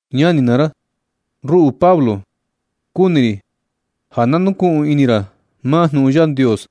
Ñani naa ra, ruꞌu Pablo, kuni ri ja na nukuꞌun ini ra maa jnuꞌun Yandios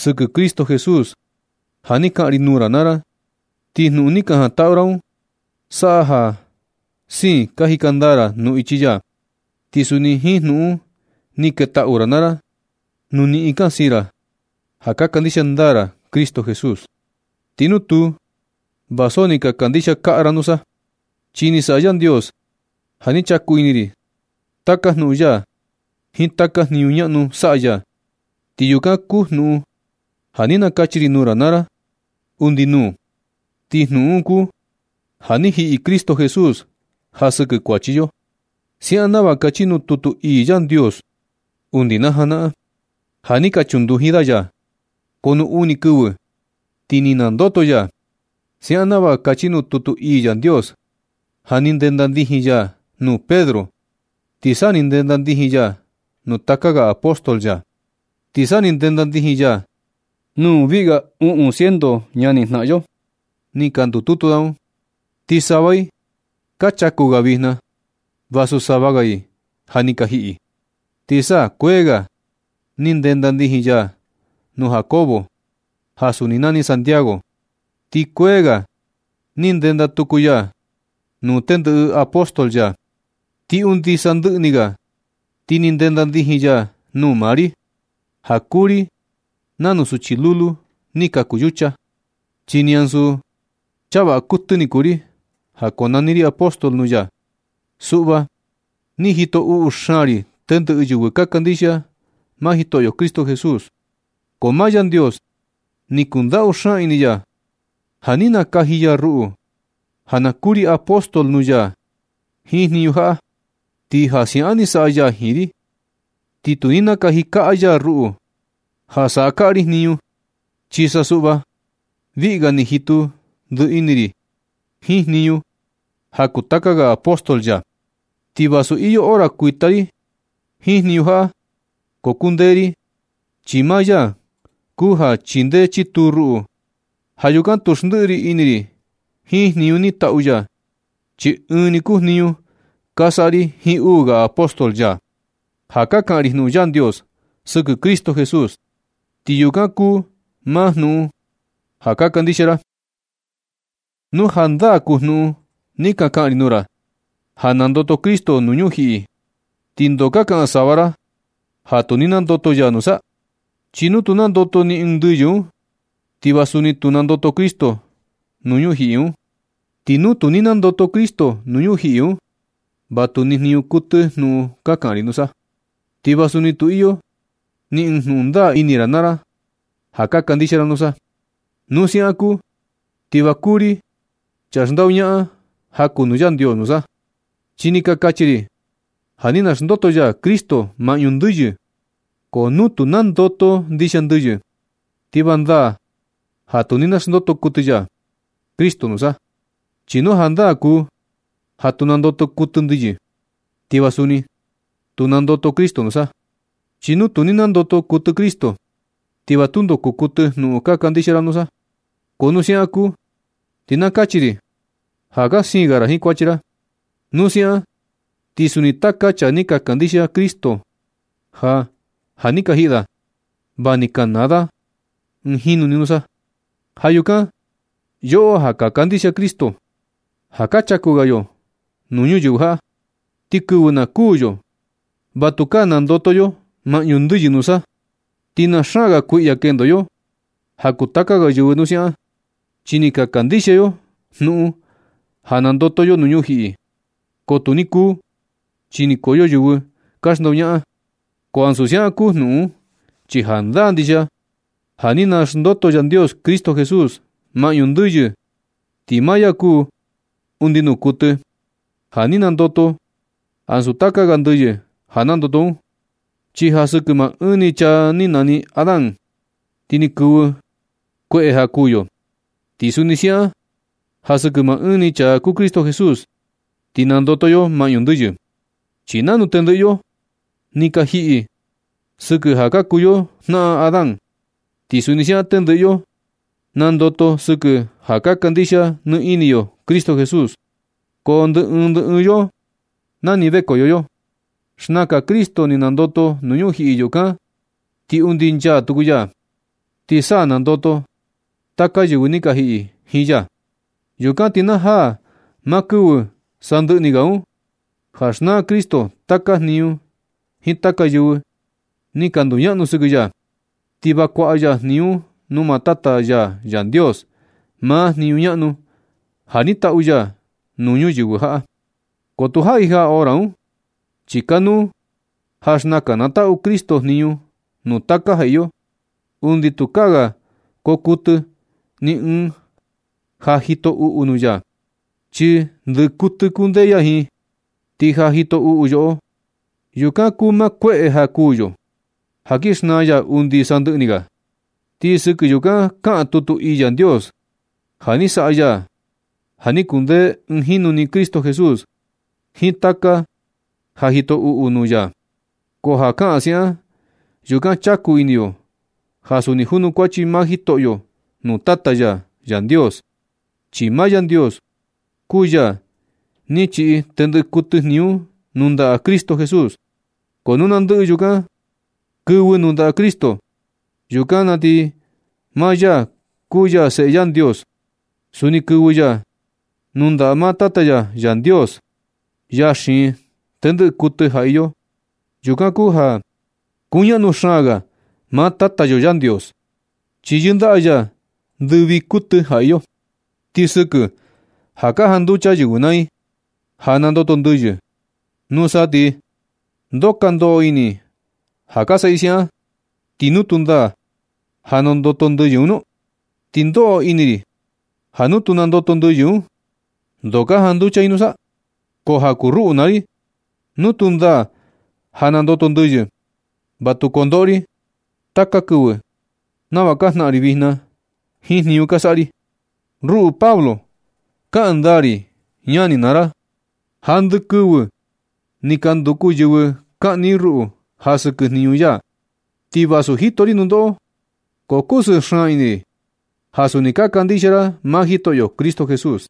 sɨkɨ Cristo Jesús ja ni kaꞌan ri nuu ra naa ra, ti jnuꞌun ni ka jantaꞌu ra un saꞌa ja siin ka jika ndaa ra nuu ichi ya. Ti suni jiin jnuꞌun un ni ketaꞌu ra naa ra nu niꞌin ka siin ra ja ka kandixia ndaa ra Cristo Jesús. Ti nu tuu, va so ni ka kandixia kaꞌa ra nusa. Chi ni saꞌa Yandios ja ni chaku ini ri taka jnuꞌun ya jiin taka jniñu ñaꞌnu saꞌa ya, ti yukan kuu jnuꞌun ja ni nakachi ri nuu ra naa ra undi nuu. Ti jnuꞌun un kuu ja ni jiꞌi Cristo Jesús ja sɨkɨ kuachi yo, siaꞌan nava kachi nuu tutu ii Yandios undi na janaꞌan, ja ni ka chunduji da ya, ko nuu uni kɨvɨ ti ni nandoto ya, siaꞌan nava kachi nuu tutu ii Yandios. Ja ni ndenda ndijin ya nuu Pedro, ti sa ni ndenda ndijin ya nuu taka ga apóstol ya. Ti sa ni ndenda ndijin ya nuu viꞌi ga uꞌun ciento ñanijnaꞌan yo ni ka ndututu da un. Ti sava i ka chaku ga vijna, vasu sava ga i ja ni ka jiꞌi. Ti sa kuee ga ni ndenda ndijin ya nuu Jacobo ja suni nani Santiago, ti kuee ga ni ndenda tuku ya nuu tendɨꞌɨ apóstol ya. Ti undi sandɨꞌɨ ni ga ti ni ndenda ndijin ya nuu maa ri, ja kuu ri nanu suchi lulu ni kaku yucha. Ti ni ansu chaa vaꞌa kuɨtɨ ni kuu ri ja konani ri apóstol nuu ya. Suꞌva ni jito uꞌu xaan ri tendɨꞌɨ yɨvɨ ka kandixia maa Jitoꞌyo Cristo Jesús. Ko maa Yandios ni kundaꞌu xaan ini ya ja ni nakaji ya ruꞌu, ja na kuu ri apóstol nuu ya jiin jniñu jaꞌa, ti ja siaꞌan ni saꞌa ya jiin ri. Ti tu ni nakaji kaꞌa ya ruꞌu ja saꞌa kaꞌa ri jniñu, chi sa suꞌva viꞌi ga ni jitu ndiꞌi ini ri jiin jniñu ja kuu taka ga apóstol ya, ti vasu iyo hora kuita ri jiin jniñu jaꞌa, ko kundee ri, chi maa ya kuu ja chindee chituu ruꞌu. Ja yukan tu xndiꞌi ri ini ri jiin jniñu ni tatu ya, chi ɨɨn ni kuu jniñu ka saꞌa ri jiin uu ga apóstol ya ja ka kaꞌan ri jnuꞌun Yandios sɨkɨ Cristo Jesús, ti yukan kuu maa jnuꞌun ja ka kandixia ra. Nu jandaa kuu jnuꞌun ni ka kaꞌan ri nuu ra, ja nandoto Cristo nuu ñujiꞌi, ¿ti ndo ka kaꞌan sava ra ja tu ni nandoto ya nusa? Chi nu tu nandoto ni ɨɨn ndɨyɨ un, ti va suni tu nandoto Cristo nuu ñujiꞌi un nusa. Ti nu tu ni nandoto Cristo nuu ñujiꞌi un, ¿va tu ni jniñu kuɨtɨ jnuꞌun ka kaꞌan ri nusa? ¿Ti va suni tu iyo ni ɨɨn jnuꞌun ndaa ini ra naa ra ja ka kandixia ra nusa? Nu siaꞌan kuu, ¿ti va ka kuu ri chaa xndoñaꞌan ja kuu nuu Yandios nusa? Chi ni ka kachi ri ja ni naxndoto ya Cristo maꞌñu ndɨyɨ. Ko nu tu nandoto ndixia ndɨyɨ, ti va ndaa ja tu ni naxndoto kuɨtɨ ya Cristo nusa. Chi nu jandaa kuu ja tu nandoto kuɨtɨ ndɨyɨ, ti va suni tu ni nandoto Cristo nusa. Chi nu tu ni nandoto kuɨtɨ Cristo, ti va tundo kuu kuɨtɨ jnuꞌun ka kandixia ra nusa. Ko nu siaꞌan kuu, ti na kachi ri ja ka siin ga ra jiin kuachi ra. Nu siaꞌan ti suni taka chaa ni ka kandixia Cristo ja ja ni ka jiꞌi da, va ni ka naa da ɨɨn jinu ni nusa. Ja yukan yoꞌo ja ka kandixia Cristo, ja ka chaku ga yo nuu ñuyɨvɨ jaꞌa, ti kɨvɨ na kuū yo, va tukaa nandoto yo maꞌñu ndɨꞌɨ nusa, ti na xaan ga kuiꞌya kendo yo ja kuu taka ga yɨvɨ nu siaꞌan. Chi ni ka kandixia yo jnuꞌun ja nandoto yo nuu ñujiꞌi ko tu ni kuu, chi ni kuu yo yɨvɨ ni ka xndoñaꞌan. Ko ansu siaꞌan kuu jnuꞌun un, chi jandaa ndixia ja ni naxndoto Yandios Cristo Jesús maꞌñu ndɨyɨ, ti maa ya kuu undi nuu kuɨtɨ ja ni nandoto ansu taka ga ndɨyɨ ja nandoto un. Chi ja sɨkɨ maa ɨɨn ni chaa ni nani Adán, ti ni kɨvɨ kueꞌe ja kuū yo. Ti suni siaꞌan ja sɨkɨ maa ɨɨn ni chaa kuu Cristo Jesús, ti nandoto yo maꞌñu ndɨyɨ. Chi nanu tendɨꞌɨ yo ni ka jiꞌi sɨkɨ ja ka kuu yo jnaꞌan Adán, ti suni siaꞌan tendɨꞌɨ yo nandoto sɨkɨ ja kandixia nɨ ini yo Cristo Jesús. Ko ndɨ ɨɨn ndɨ ɨɨn yo nani vekoyo yo. Xnakan Cristo ni nandoto nuu ñujiꞌi yukan na ti undi nchaa tuku ya, ti sa nandoto taka yɨvɨ ka yɨꞌɨ jiin ya. Yukan ti na jaa maa kɨvɨ sandɨꞌɨ ni ga un ja xnaa Cristo taka jniñu jiin taka yɨvɨ ni ka nduñaꞌnu sɨkɨ ya, ti na kuaꞌa ya jniñu un nuu maa Tata ya Yandios, maa jniñu ñaꞌnu ja ni taꞌu ya nuu ñuyɨvɨ jaꞌa. Ko tu jaꞌi jaa hora un, chi kanuu ja xnakan na taꞌu Cristo jniñu nuu taka ja iyo, undi tukaa ga koo kuɨtɨ ni ɨɨn ja jito uꞌu nuu ya, chi ndɨꞌɨ kuɨtɨ kundee ya jiin. Ti ja jito uꞌu yoꞌo, yukan kuu maa kueꞌe ja kuū yo, ja kin xnaa ya undi sandɨꞌɨ ni ga. Ti sɨkɨ yukan kaꞌan tutu ii Yandios ja ni saꞌa ya ja ni kundee ɨɨn jinu ni Cristo Jesús jiin taka ja jito uꞌu nuu ya. Ko ja kaꞌan siaꞌan, yukan chaku ini yo ja suni junukuachi maa Jitoꞌyo nuu Tata ya Yandios, chi maa Yandios kuu ya ni chiꞌi tendɨꞌɨ kuɨtɨ jniñu un nuu ndaꞌa Cristo Jesús. Ko nu na ndɨꞌɨ yukan kɨvɨ nuu ndaꞌa Cristo, yukan na ti maa ya ja kuu ya Seꞌe Yandios, suni kɨvɨ ya nuu ndaꞌa maa Tata ya Yandios, Yaa xiin tendɨꞌɨ kuɨtɨ ja iyo. Yukan kuu ja kuñaꞌnu xaan ga maa Tata yo Yandios, chi yɨndaꞌa ya ndɨ vii kuɨtɨ ja iyo. Ti sɨkɨ ja ka janducha yɨvɨ naa i ja nandoto ndɨyɨ, nusa ti ¿ndoo ka ndoꞌo ini i ja ka saꞌa i siaꞌan, ti nu tu ndaa ja nandoto ndɨyɨ un nu? Ti ndoꞌo ini ri ja nu tu nandoto ndɨyɨ un, ¿ndoo ka janducha i nusa? Ko ja kuu ruꞌu naa ri, nu tu ndaa ja nandoto ndɨyɨ, va tu kondoꞌo ri taka kɨvɨ nava ka jnaꞌan ri vijna jiin jniñu ka saꞌa ri. Ruꞌu Pablo, kaꞌan ndaa ri ñani naa ra, ja ndɨ kɨvɨ ni ka nduku yɨvɨ kaꞌni i ruꞌu ja sɨkɨ jniñu ya. Ti vasu jito ri nundoꞌo, ko kusɨɨ xaan ini ri ja suni ka kandixia ra maa Jitoꞌyo Cristo Jesús.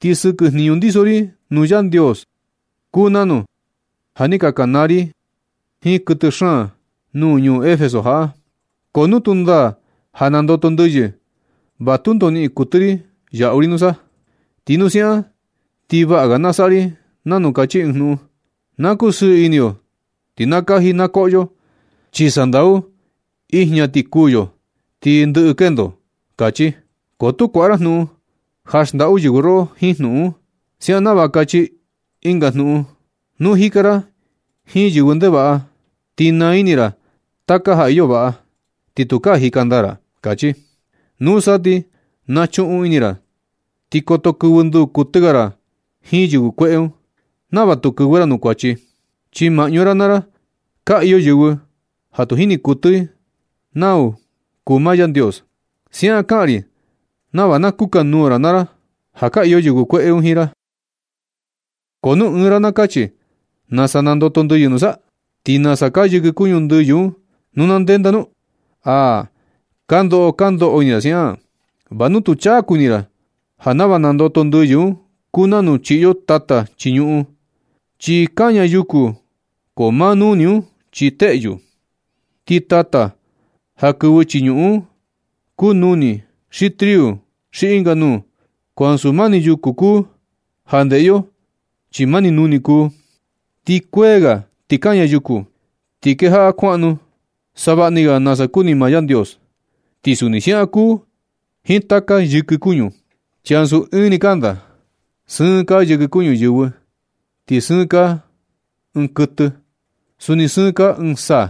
Ti sɨkɨ jniñu ndiso ri nuu Yandios, kuu nanu ja ni ka kanaa ri jiin kuɨtɨ xaan nuu ñuu Efeso jaꞌa. Ko nu tu ndaa ja nandoto ndɨyɨ, va tundo niꞌin kuɨtɨ ri yaꞌu ri nusa. Ti nu siaꞌan, ti vaꞌa ga na saꞌa ri nanu kachi ɨɨn jnuꞌun: “Na kusɨɨ ini yo ti na kaji na koꞌo yo, chi sandau ijña ti kuū yo ti ndɨꞌɨ kendo”, kachi. Ko tu kuaꞌa ra jnuꞌun ja xndaꞌu yɨvɨ roꞌo jiin jnuꞌun un, siaꞌan nava kachi ɨnga jnuꞌun i: “Nu jika ra jiin yɨvɨ ndevaꞌa ti naa ini ra taka ja iyo vaꞌa ti tukaa jika ndaa ra”, kachi. Nusa ti nachuꞌun ini naa ra ti koto kɨvɨ nduu kuɨtɨ ga ra jiin yɨvɨ kueꞌe un, nava tu kɨvɨ ra nuu kuachi, chi maꞌñu ra naa ra ka iyo yɨvɨ ja tu jini kuɨtɨ i nau kuu maa Yandios. Siaꞌan kaꞌan ri nava na kukanuu ra naa ra ja ka iyo yɨvɨ kueꞌe un jiin ra. Ko nu ɨɨn ra na kachi: “¿Nasa nandoto ndɨyɨ nusa? ¿Ti nasa kaa yɨkɨ kuñu ndɨyɨ un nu na ndenda nu?” ¡Aa! Ko ndoo ka ndoꞌo ini ra siaꞌan, va nu tu chaku ini ra ja nava nandoto ndɨyɨ un kuu nanu chiꞌi yo tata chii ñuꞌun, chi kaña yuku ko maa nuni un chi teꞌyu. Ti tata ja kɨvɨ chii ñuꞌun un kuu nuni, xi triu xi ɨnga nuu, ko ansu mani yuku kuu ja ndeꞌe yo chi mani nuni kuu. Ti kuee ga ti kaña yuku, ti kejaꞌa kuaꞌnu savaꞌa ni ga nasa kuni maa Yandios. Ti suni siaꞌan kuu jiin taka yɨkɨ kuñu, chi ansu ɨɨn ni kanda. Sɨɨn kaa yɨkɨ kuñu yɨvɨ, ti sɨɨn kaa ɨɨn kuɨtɨ, suni sɨɨn kaa ɨɨn saa,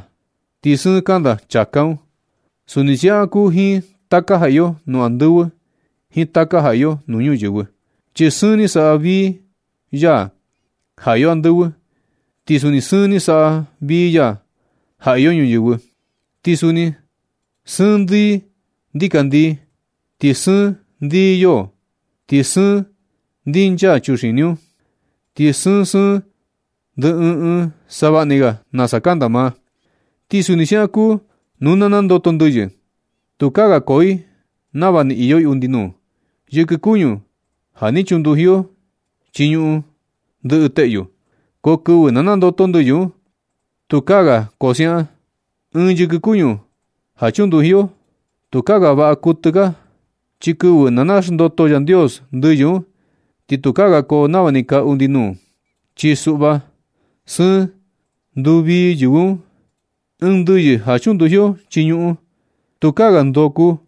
ti sɨɨn kanda chāká un. Suni siaꞌan kuu jiin taka ja iyo nuu andɨvɨ jiin taka ja iyo nuu ñuyɨvɨ. Chi sɨɨn ni saꞌa vii ya ja iyo andɨvɨ, ti suni sɨɨn ni saꞌa vii ya ja iyo ñuyɨvɨ. Ti suni sɨɨn ndii ndikandii, ti sɨɨn ndii yoo. Ti sɨɨn ndinchaa chuxini un, chi sɨɨn sɨɨn ndii ɨɨn ɨɨn, savaꞌni ga nasa kanda maa. Ti suni siaꞌan kuu nu na nandoto ndɨyɨ. Tukaa ga koo i nava ni iyo i undi nuu. Yɨkɨ kuñu ja ni chunduji yo chii ñuꞌun ndɨꞌɨ teꞌyu, ko kɨvɨ na nandoto ndɨyɨ un, tukaa ga kaa siaꞌan. Ɨɨn yɨkɨ kuñu ja chunduji yo, tukaa ga vaꞌa kuɨtɨ kaa, ko kɨvɨ na naxndoto Yandios ndɨyɨ un ti tukaa ga koo nava ni kaa undi nuu, chi suꞌva sɨɨn nduvii yɨvɨ un. Ɨɨn ndɨyɨ ja chunduji yo chii ñuꞌun, tukaa ga ndoo kuu,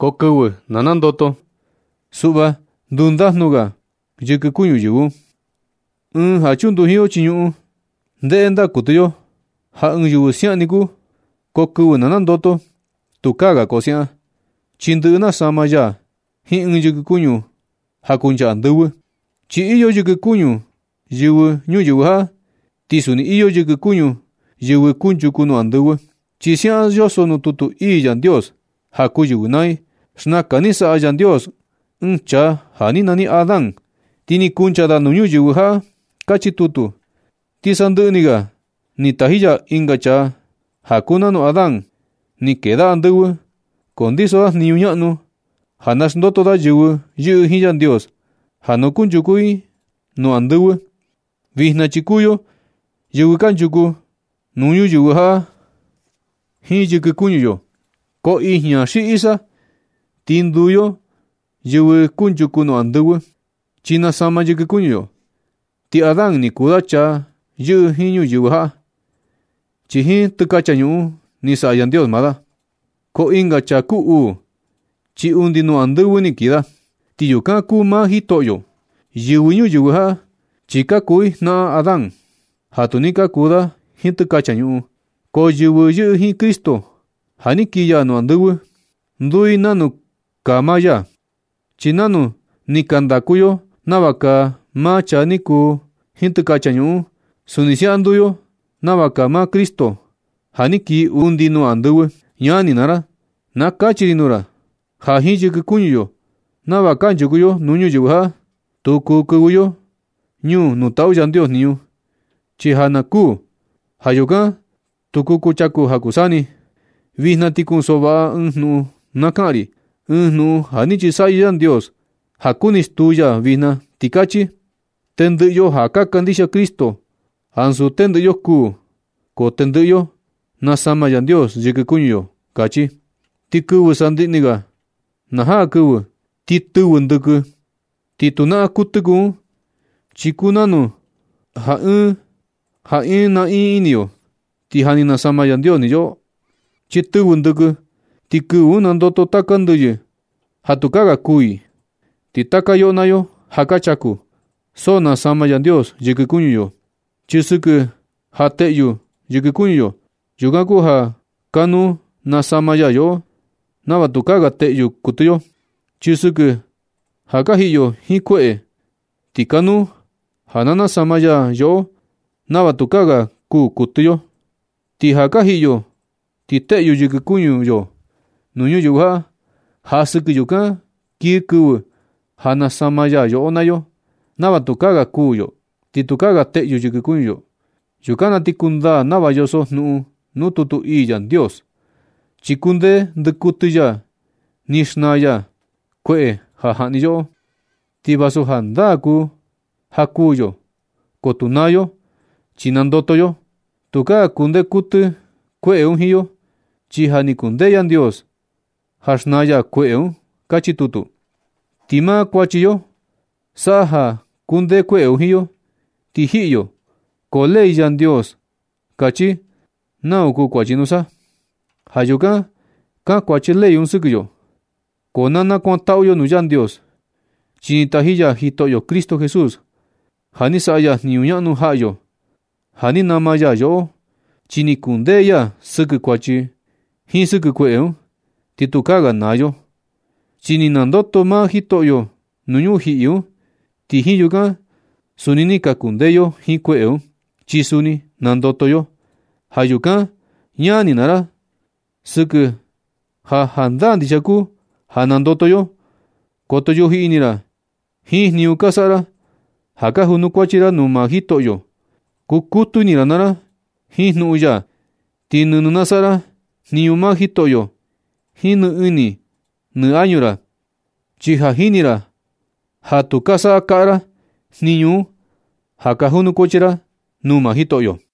ko kɨvɨ na nandoto, suꞌva ndu ndajnu ga yɨkɨ kuñu yɨvɨ un. Ɨɨn ja chunduji yo chii ñuꞌun, ndeꞌe ndaa kuɨtɨ yo ja ɨɨn yɨvɨ siaꞌan ni kuu, ko kɨvɨ na nandoto, tukaa ga koo siaꞌan, chi ndɨꞌɨ nasama ya jiin ɨɨn yɨkɨ kuñu ja kuncha andɨvɨ. Chi iyo yɨkɨ kuñu yɨvɨ ñuyɨvɨ jaꞌa, ti suni iyo yɨkɨ kuñu yɨvɨ kunchuku nuu andɨvɨ. Chi siaꞌan yoso nuu tutu ii Yandios: “Ja kuu yɨvɨ naa i, xnakan ni saꞌa Yandios ɨɨn chaa ja ni nani Adán, ti ni kuncha da nuu ñuyɨvɨ jaꞌa”, kachi tutu. Ti sandɨꞌɨ ni ga ti taji ya ɨnga chaa ja kuu nanu Adán. Ni kee da andɨvɨ, ko ndiso da jniñu ñaꞌnu ja naxndoto da yɨvɨ yɨꞌɨ jiin Yandios ja na kunchuku i nuu andɨvɨ. Vijna chi kuu yo yɨvɨ kanchuku nuu ñuyɨvɨ jaꞌa jiin yɨkɨ kuñu yo, ko ijña xi isa, ti nduu yo yɨvɨ kunchuku nuu andɨvɨ, chi nasama yɨkɨ kuñu yo. Ti Adán ni kuu da ɨɨn chaa yɨꞌɨ jiin ñuyɨvɨ jaꞌa, chi jiin tɨkacha ñuꞌun ni saꞌa Yandios maa da. Ko ɨnga chaa kuu uu chi undi nuu andɨvɨ ni kii da, ti yukan kuu maa Jitoꞌyo. Yɨvɨ ñuyɨvɨ jaꞌa chi ka kuu i jnaꞌan Adán ja ni kuu da jiin tɨkacha ñuꞌun. Ko yɨvɨ yɨꞌɨ jiin Cristo, ja ni kii ya nuu andɨvɨ, nduu i nanu kuu maa ya. Chi nanu ni ka ndaku yo nava kaa maa chaa ni kuu jiin tɨkacha ñuꞌun un, suni siaꞌan nduu yo nava kaa maa Cristo, ja ni kii undi nuu andɨvɨ. Ñani naa ra, na kachi ri nuu ra, ja jiin yɨkɨ kuñu yo nava kanchuku yo nuu ñuyɨvɨ jaꞌa, tu kuu kɨvɨ yo ñuu nuu taꞌu Yandios jniñu, chi ja naa kuu. Ja yukan tu kuchaku ja kuu saa ni. Vijna ti kunsoꞌo vaꞌa ɨɨn jnuꞌun na kaꞌan ri, ɨɨn jnuꞌun ja ni chisaꞌyɨ Yandios ja kuni stuu ya vijna, ti kachi: “Tendɨꞌɨ yo ja ka kandixia Cristo, ansu tendɨꞌɨ yo kuū, ko tendɨꞌɨ yo nasama Yandios yɨkɨ kuñu yo”, kachi. Chi kɨvɨ sandɨꞌɨ ni ga na jaa kɨvɨ, ti tɨvɨ ndɨkɨ. Ti tu naꞌan kuɨtɨ kuu un, chi kuu nanu ja ɨɨn nakuani ni yo, ti ja ni nasama ni Yandios yoꞌo. Chi tɨvɨ ndɨkɨ, ti kɨvɨ un nandoto taka ndɨyɨ ja tukaa ga kuū i. Ti taka yoꞌo naa yo ja ka chaku, so nasama Yandios yɨkɨ kuñu yo. Chi sɨkɨ ja teꞌyu yɨkɨ kuñu yo, yukan kuu ja kanuu nasama ya yoꞌo nava tukaa ga teꞌyu kuɨtɨ yo. Chi sɨkɨ ja ka jiꞌi yo jiin kueꞌe, ti kanuu ja na nasama ya yoꞌo nava tukaa ga kuū kuɨtɨ yo. Ti ja ka jiꞌi yo ti teꞌyu yɨkɨ kuñu yo nuu ñuyɨvɨ jaꞌa, ja sɨkɨ yukan kii kɨvɨ ja nasama ya yoꞌo naa yo nava tukaa ga kuū yo, ni tukaa ga teꞌyu yɨkɨ kuñu yo. Yukan na ti kundaa nava yoso jnuꞌun nuu tutu ii Yandios: “Ni kundee ndɨkuɨtɨ ya, ni xnaa ya kueꞌe ja jaꞌni yoꞌo. Ti vasu jandaa kuū ja kuu yo, ko tu naa yo, chi nandoto yo. Tukaa kundee kuɨtɨ kueꞌe un jiin yo, chi ja ni kundee Yandios ja xnaa ya kueꞌe un”, kachi tutu. Ti maa kuachi yo saꞌa ja kundee kueꞌe un jiin yo ti jiꞌi yo. Ko ley Yandios kachi nau kuu kuachi nusa. Ja yukan kankuachi ley un sɨkɨ yo. Ko na kuantaꞌu yo nuu Yandios, chi ni taji ya Jitoꞌyo Cristo Jesús ja ni saꞌa ya jniñu ñaꞌnu jaꞌa yo ja ni nama ya yoꞌo, chi ni kundee ya sɨkɨ kuachi jiin sɨkɨ kueꞌe un. Ti tukaa ga naa yo, chi ni nandoto maa Jitoꞌyo nuu ñujiꞌi un. Ti jiin yukan suni ni ka kundee yo jiin kueꞌe un, chi suni nandoto yo. Ja yukan ñani ri naa ra, sɨkɨ ja jandaa ndixia kuu ja nandoto yo, koto yuji ini ra jiin jniñu ka saꞌa ra ja ka junukuachi ra nuu maa Jitoꞌyo. Kukutu ini naa ra jiin jnuꞌun ya, ti nɨnɨ na saꞌa ra jniñu maa Jitoꞌyo jiin nɨ ini nɨ añu ra. Chi ja jini ra ja tu ka saꞌa kaꞌa ra jniñu un ja ka junukuachi ra nuu maa Jitoꞌyo.